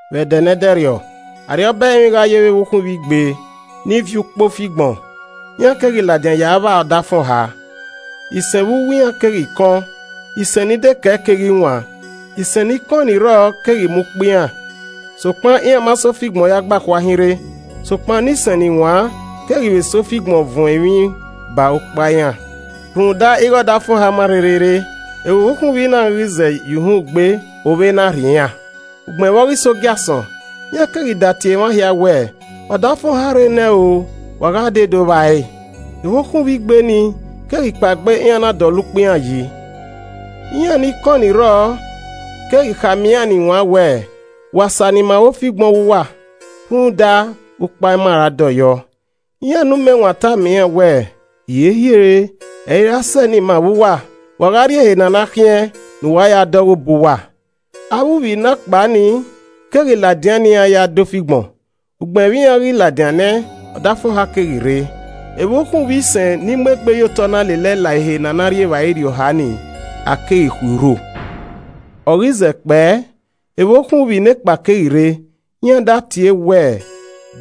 “Vbe ẹdẹ ne ẹdẹrriọ, Arriọba ẹrinmwi gha yevbe evbokhunvbi igbe ni viọ ukpa ofigbọn, iran keghi ladian ya vba ọdafẹn ọha. Isen vbe uwu iran keghi kọn, isẹn ni dekẹe keghi waan. Isen ni kọẹn ni rrọọ keghi mu ukpa iran, sokpan iran ma sa ofigbọn ya gbe akhua hinrre. Sokpan ne isẹn ni waan keghi vbe sa ofigbọn vuọn emwi ba ukpa iran. Rhunmwuda ighe ọdafẹn ọha ma rherhe rre, evbokhunvbi na ghi zẹ ye uhunmwu gbe, ovbe na rhie iran. “Ugbẹn vbe ọ ghi sẹ ogiasọn, iran keghi datie emwa hia wẹẹ, ‘Ọdafẹn ọha rre nẹ o, wa gha dee do vba ẹre.’ Evbokhunvbi igbe ni, keghi kpaegbe iran na dọlọ urhukpa iran yi. Iran ni kọẹn ni rrọọ keghi khama iran ni waan wẹẹ, ‘Wa sa ne ima vbe ofigbọn ọghe uwa rhunmwuda, ukpa ima ra dọyọ.’ Iran ne umẹwaẹn tama iran wẹẹ, ‘Hiehiere, ẹ i ra sẹ ne ima vbe uwa, wa gha rrie ehe ne a na khiẹn ne uwa ya dẹ ọghe obọ uwa.’ Avbe uvbi ne akpa ni keghi ladian ne iran ya dẹ ofigbọn. Ugbẹn vbe iran ghi ladian nẹ, ọdafẹn ọha keghi rre. Evbokhunvbi isẹn ni mu egbe ye otọ na lelẹe la ehe ne a na rri evbare irhiọha nii, a keghi khui urho. “Ọ ghi zẹ kpẹe, evbokhunvbi nekpa keghi rre, iran da tie wẹẹ,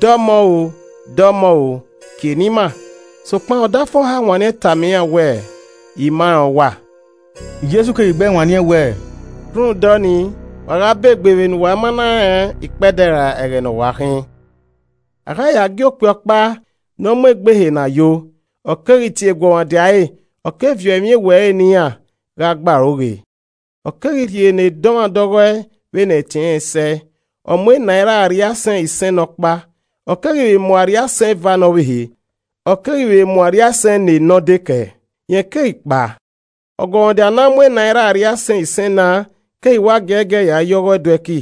‘Dọmọ o! dọmọ o! kie ne ima.’ Sokpan ọdafẹn ọha wanniẹn tama iran wẹẹ, ‘I ma rẹn uwa.’” Jesu keghi gbẹe wanniẹn wẹẹ, “Rhunmwuda ọnii, wa gha ba egbe vbe ne uwa ma na rẹn ikpẹdẹ ra ẹghẹ ne ọ wa khin. “A gha ya ẹe gie okpia ọkpa ne ọ mu egbe ehe ne a yo, ọ keghi tie eguọmwadia ẹre, ọ keghi viọ emwi ewe ẹre ne iran gha gbe aro ghe. Ọ keghi rhie ne dọmwadẹ ọghọe vbene ẹtin ẹnrẹn sẹe, ọ mu enaira arriaisẹn isẹn ne ọkpa, ọ keghi vbe mu arriaisẹn eva ne ọvbehe, ọ keghi vbe mu arriaisẹn ne nọ dekẹe. Rẹn keghi kpao. Ọguọmwadia ne a mu enaira arriaisẹn isẹn na keghi wa giẹgiẹ ya ye ọghọe do ẹki,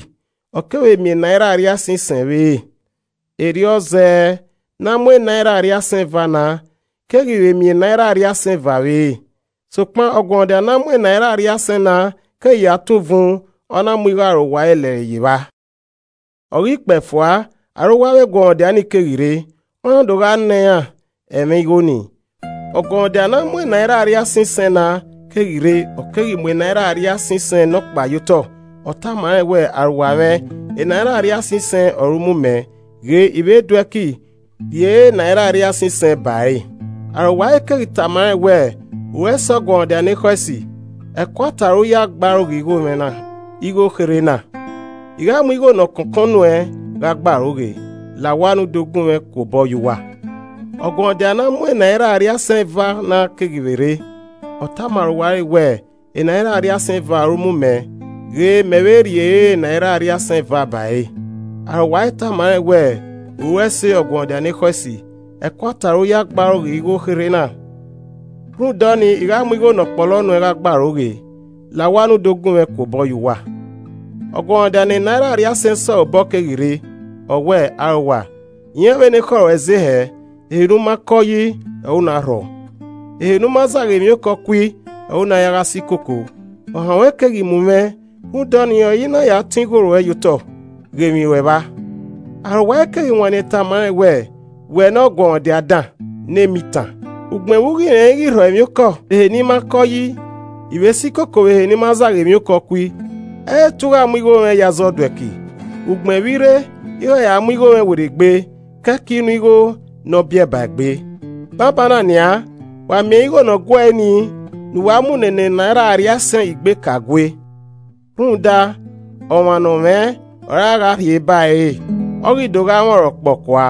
ọ kevbe miẹn enaira arriaisẹn isẹn vbe ere. Erriọ zẹẹ, ne a mu enaira arriaisẹn eva na, keghi vbe miẹn enaira arriaisẹn eva vbe ere. Sokpan ọguọmwadia ne a mu enaira arriaisẹn na keghi ya tọn uvun, ọ na mu igho arowa ẹre lẹre ye evba. “Ọ ghi kpee fua, arowa avbe eguọmwadia nii keghi rre, ọ na do gha nọ iran ẹmwẹ igho nii. Ọguọmwadia ne a mu enaira arriaisẹn isẹn na keghi rre, ọ keghi mu enaira arriaisẹn isẹn nọkpa ye otọ, ọ tama rẹn wẹ, ‘Arowa mwẹ enaira arriaisẹn isẹn ọre u mu mẹ, ghe I vbe do ẹki rri ere enaira arriaisẹn isẹn ba ẹre.’ Arowa ẹre keghi tama rẹn wẹẹ, ‘U ru ẹse ọguọmwadia ne ekhọe esi, ẹkoata ọre u ya gbe aro ghe igho kherhe na, I gha mu igho ne ọ kọnkọn nuẹn gha gbe aro ghe. La owa ne u do gunmwẹ ku obọ ye uwa.’ Ọguọmwadia ne a mu enaira arriaisẹn eva na keghi vbe rre, ọ tama arowa ẹre wẹẹ, ‘Enaira arriaisẹn eva ọre u mu mẹ, ghe, mẹ vbe rri ere enaira arriaisẹn eva ba ẹre.’ Arowa ẹre tama rẹn wẹẹ, ‘U ru ẹse ọguọmwadia ne ekhọe esi, ẹkoata ọre u ya gbe aro ghe igho kherhe na. Rhunmwuda ọnii, I gha mu igho ne ọ kpọlọ nuẹn gha gbe aro ghe, la owa ne u do gunmwẹ ku obọ ye uwa.’ Ọguọmwadia ne enaira arriaisẹn sẹ ọre obọ keghi rre, ọ wẹẹ, ‘Arowa, i rẹn vbene ekhọe ruẹ ze hẹẹ, ehe ne u ma kọ yi ọre u na rhọ, ehe ne u ma zagha emwiokọ kui ọre u na ya gha si koko. Ohan ruẹn keghi mu mwẹ, rhunmwuda ọnii ọre I na ya tọn igho ruẹ ye otọ, ghe emwi ruẹ vba.’ Arowa ẹre keghi wanniẹn tama rẹn wẹẹ, ‘Wẹ ne ọguọmwadia dan, ne emitan, ugbẹn vbe u ghi rẹn ighẹ I rhọ emwiokọ vbe ehe ne I ma kọ yi, I vbe si koko vbe ehe ne I ma zagha emwiokọ kui. Ẹ i re te u gha mu ighomwẹ ye aza ọduẹki, ugbẹn vbe i rre, I gha ya mu igho mwẹ werriegbe, kẹe ke inu igho ne ọ biẹ ba egbe. Banbanna nian, wa miẹn ẹre igho ne ọ guee nii ne uwa mu ne ne enaira arriaisẹn igbe ka gue. Rhunmwuda, ọmwa ne ọ mwẹ ọre a gha rhie ba ẹre re, ọ ghi do gha mwẹ ọnrẹn ọkpọkua.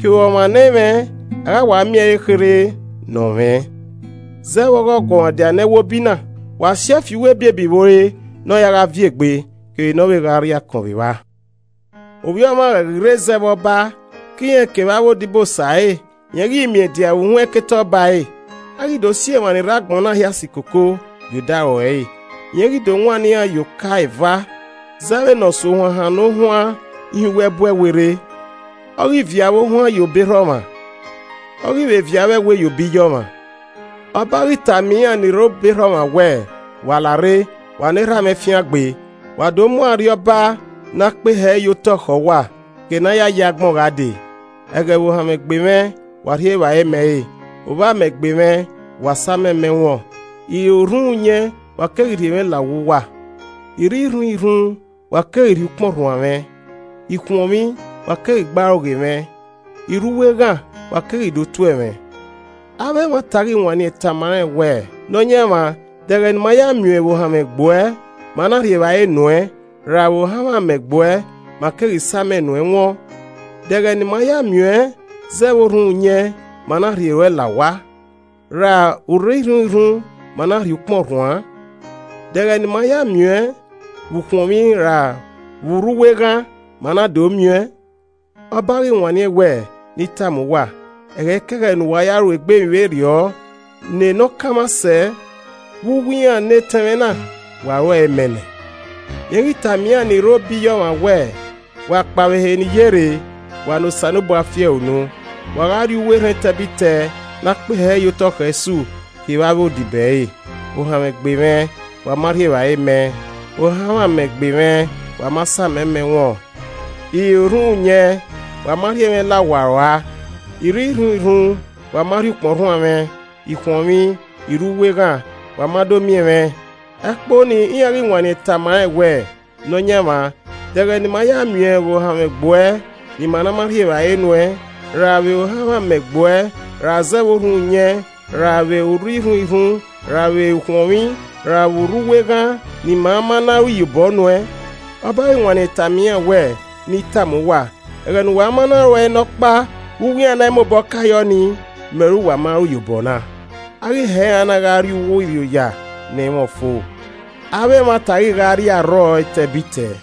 Kevbe ọmwa ne ẹ i mwẹ, a gha wa miẹn ẹre ekherhe ne ọ mwẹ. Zẹ vbe ọghe ọguọmwadia ne ẹwobi na, wa si ẹe fi uwu ebiebi vbe ore ne ọ ya gha viẹ egbe, kevbe ne ọ vbe gha rri akọn vbe evba.’ “Ovbi Ọmwa ghẹ ghi rre zẹ vbe ọba ke irẹn kevbe avbe odibosa ẹre, rẹn ghi miẹn dia vbe uhunmwu ẹkete ọba ẹre. A ghi do si emwa ni rre agbọn na hia si koko ye odaro ẹre. Rẹn ghi do wannọ iran ye oka eva zẹ vbene Ọsuohuan hannọ ohuan hin uwu ẹbu ẹwe rre. Ọ ghi viọ avbe ohuan ye obọ erha ọmwa, ọ ghi vbe viọ avbe ẹwe ye obọ iye ọmwa. Ọba ghi tama iran ni rre obọ erha ọmwa wẹẹ, ‘Wa larre, wa ne erha mwẹ fiangbe, wa do mu arriọba ne a kpehe ẹre ye otọ khẹ uwa ke ne a ya yi agbọn gha dee. Ẹghẹ vbe ovbamẹ gbe mwẹ, wa rhie evbare mẹ re, ovbamẹ gbe mwẹ, wa sa amẹ mẹ wọn. I re orhunmwuyẹn, wa keghi rhie mwẹ la owa uwa. I rre irhunmwirhun, wa keghi rhie ukpọn rhuan mwẹ, I khuọnmwi, wa keghi gbe aro ghe mwẹ, I rre uwu eghan, wa keghi do tuẹ mwẹ.’ Avbe emwata ghi wanniẹn tama rẹn wẹẹ, ‘Nọyaẹnmwa, de ẹghẹ ne ima ya miẹn uẹn vbe ohanmwẹ gbuẹ, ma na rhie evbare nuẹn, ra vbe ohanmwẹ amẹ gbuẹ, ma keghi sa amẹ nuẹn wọn? De ẹghẹ ne ima ya miẹn uẹn zẹ vbe orhunmwuyẹn, ma na vbe rhie ruẹ la owa, ra vbe u rre irhunmwirhun ma na rhie ukpọn rhuan? De ẹghẹ ne ima ya miẹn uẹn vbe u khuọnmwi ra vbe u rre uwu eghan, ma na do miẹn uẹn?’ Ọba ghi wanniẹn wẹẹ, ‘Ne I tama uwa, ẹghẹikẹghẹ ne uwa ya ru egbe emwi vberriọ ne ne ọ kanmwa sẹ vbe uwu iran ne etẹn mwẹ na, wa ruẹe mẹ nẹ.’ “Rẹn ghi tama iran ni rre ọre obọ iye ọmwa wẹẹ, ‘Wa kpao vbe ehe ne I ye rre, wa ne Osanobua fi ẹre unu, wa gha rrie uwu erhẹn etẹbitẹ ne a kpehe ẹre ye otọ khẹ Esu kevbe avbe odibo ẹre. Ohanmwẹ gbe mwẹ, wa ma rhie evbare mẹ, ohanmwẹ amẹ gbe mwẹ wa ma samẹ mẹ wọn, I re orhunmwuyẹn, wa ma rhie mwẹ la owa rua, I rre irhunmwirhun, wa ma rhie ukpọn rhuan mwẹ, I khuọnmwi, I rre uwu eghan, wa ma do miẹn mwẹ.’ Ẹkpo nii iran ghi wanniẹn tama rẹn wẹẹ, ‘Nọyaẹnmwa, de ẹghẹ ne ima ya miẹn uẹn vbe ohanmwẹ gbuẹ ne ima ma na rhie evbare nuẹn, ra vbe ohanmwẹ amẹ gbuẹ, ra zẹ vbe erhunmwuyẹn ra vbe u rre irhunmwirhun ra vbe u khuọnmwi ra vbe u rre uwu eghan ne ima ma na ru iyobọ nuẹn?’ Ọba ghi wanniẹn tama iran wẹẹ, ‘Ne I tama uwa, ẹghẹ ne uwa ma na ru ẹe ne ọkpa vbe uwu iran ne a i mobọ ka yọ ni, mẹ ọre uwa ma ru iyobọ na.’ A ghi hẹ iran na gha rrie uwu irrioya ne ẹ i mwẹ ọfo, avbe emwata ghi gha rrie arrọọ etẹbitẹ.”